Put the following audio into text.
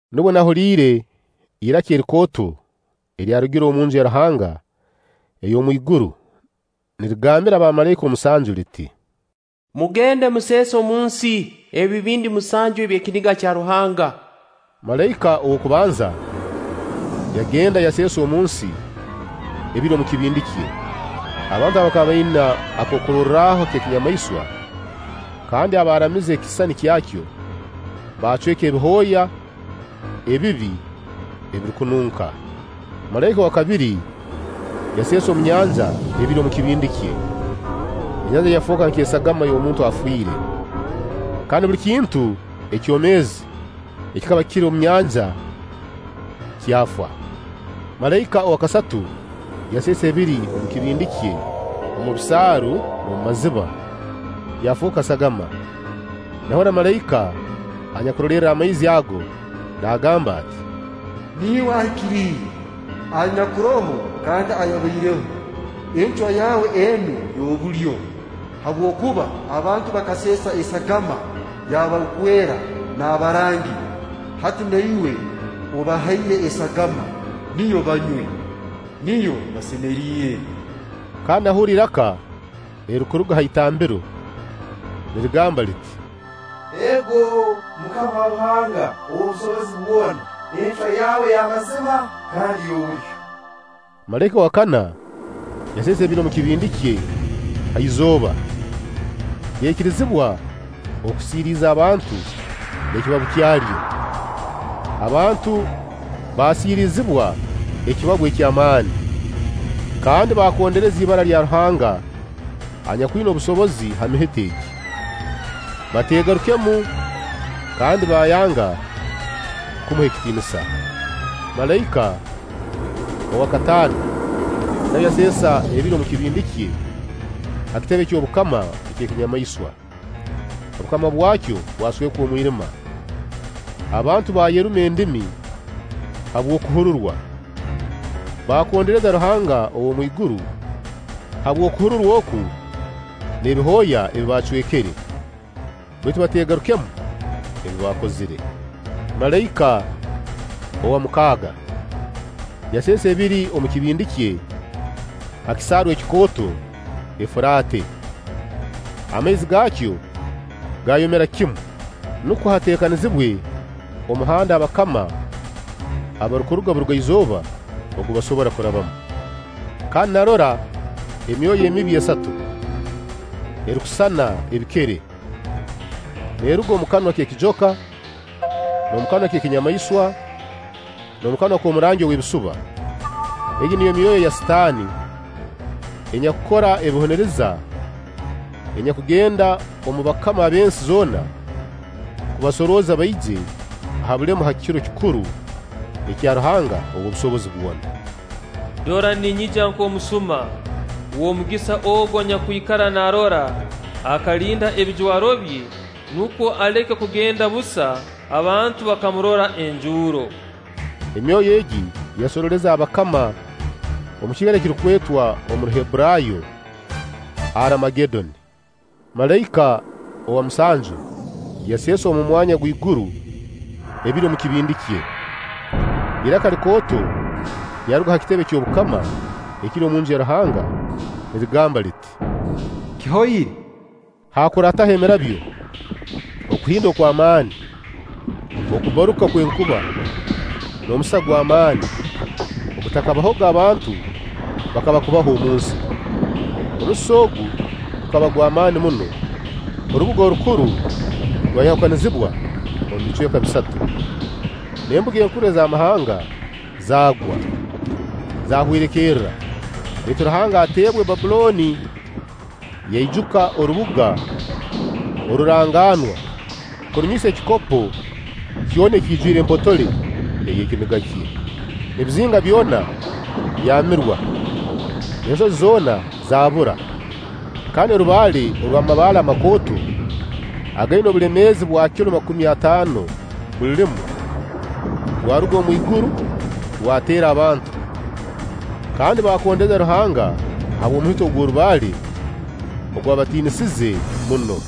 Nubwo nahuliire iraka erikooto eryarugire omu Nju ya Ruhanga ey'omwiguru, nirigambira bamalaika omusanju liti: “Mugende museese omunsi ebibindi musanju eby'ekiniga kya Ruhanga.” Malaika ow'okubanza yagenda yaseesa omunsi ebiri omu kibindi kye, abantu abakaba baina akororwaho ak'ekinyamaiswa kandi abaaramize ekisisani kyakyo baacweka ebihooya ebibi ebirukununka. Malaika owa kabiri yaseesa omu nyanja ebiri omu kibindi kye, enyanja yafooka nk'esagama y'omuntu afiire, kandi buli kintu ekyomeezi ekikaba kiri omu nyanja kyafa. Malaika owa kasatu yaseesa ebiri omu kibindi kye omu bisaaru n'omu maziba, byafooka sagama. Nahurra malaika anyakurolerra amaizi ago naagamba ati: “Niiwe Ahikiriire, anyakuroho kandi ayabaireho, encwa yawe enu y'obulyo. Habwokuba abantu bakaseesa esagama y'abarukwera n'abarangi, hati na Iwe obahaire esagama, niyo banywe. Niyo basemeriire!” Kandi nahurra iraka erirukuruga ha itambiro nirigamba liti: “Ego, MUKAMA Ruhanga ow'obusobozi bwona, encwa yawe y'amazima kandi y'obulyo!” Malaika owa kana yaseesa ebiri omu kibindi kye ha izooba, lyaikirizibwa okusiiriiza abantu n'ekibabu kyalyo. Abantu baasiirizibwa ekibabu eky'amaani, kandi baakondereza ibara lya Ruhanga anyakwina obusobozi ha mihito egi, bateegarukemu kandi baayanga kumuha ekitiinisa. Malaika owa kataano nawe yaseesa ebiri omu kibindi kye ha kitebe ky'obukama eky'ekinyamaiswa. Obukama bwakyo bwaswekwa omwirima; abantu baayeruma endimi habw'okuhururwa baakondereza Ruhanga ow'omu iguru habw'okuhururwa oku n'ebihooya ebi bacwekere, baitu bateegarukemu ebi baakozire. Malaika owa mukaaga yaseesa ebiri omu kibindi kye ha kisaaru ekikooto Efuraate. Amaizi gaakyo gaayomera kimu, nukwo hateekanizibwe omuhanda abakama abarukuruga Burugaizooba ogu basobora kurabamu. Kandi narora emyoyo emibi esatu, erukusisana ebikere, neeruga omu kanwa k'ekijoka, omu kanwa k'ekinyamaiswa, n'omu kanwa k'omurangi ow'ebisuba. Egi niyo myoyo ya Sitaani enyakukora ebihuniriza, enyakugenda omu bakama ab'ensi zoona kubasorooza baije ha bulemu ha kiro kikuru ekya Ruhanga ow'obusobozi bwona. (“Dora, ninyija nk'omusuma! W'omugisa ogu anyakwikara naarora, akalina ebijwaro bye, nukwo aleke kugenda busa, abantu bakamurora enjuuro!”) Emyoyo egi yasorooleza abakama omu kiikaro ekirukwetwa omu Ruhebburaayo: Aramagedoni. Malaika owa musanju yaseesa omu mwanya gw'iguru ebiri omu kibindi kye. Iraka likooto lyaruga ha kitebe ky'obukama ekiri omu Nju ya Ruhanga nirigamba liti: “Kihoire!” Haakurataho emirabyo, okuhinda kw'amaani, okubbaruka kw'enkuba, n'omusisa gw'amaani ogutakabahoga abantu baakaba kubaho omu nsi. Omusisa ogu gukaba gw'amaani muno. Orubuga orukuru rwayahukanizibwa omu bicweka bisatu, n'embuga enkuru ez'amahanga zaagwa, zaahwerekerra, baitu Ruhanga ateebwe Bbabbulooni, yaijuka orubuga oruranganwa kurunywisa ekikopo kyona ekiijwire empotole ey'ekiniga kye. Ebizinga byona byamirwa, n'ensozi zoona zaabura; kandi orubaale orw'amabaale amakooto againa obulemeezi obwa kilo makumi ataano buli limu, rwaruga omwiguru rwateera abantu, kandi baakondereza Ruhanga habw'omuhito ogw'orubaale ogwabatiinisize muno.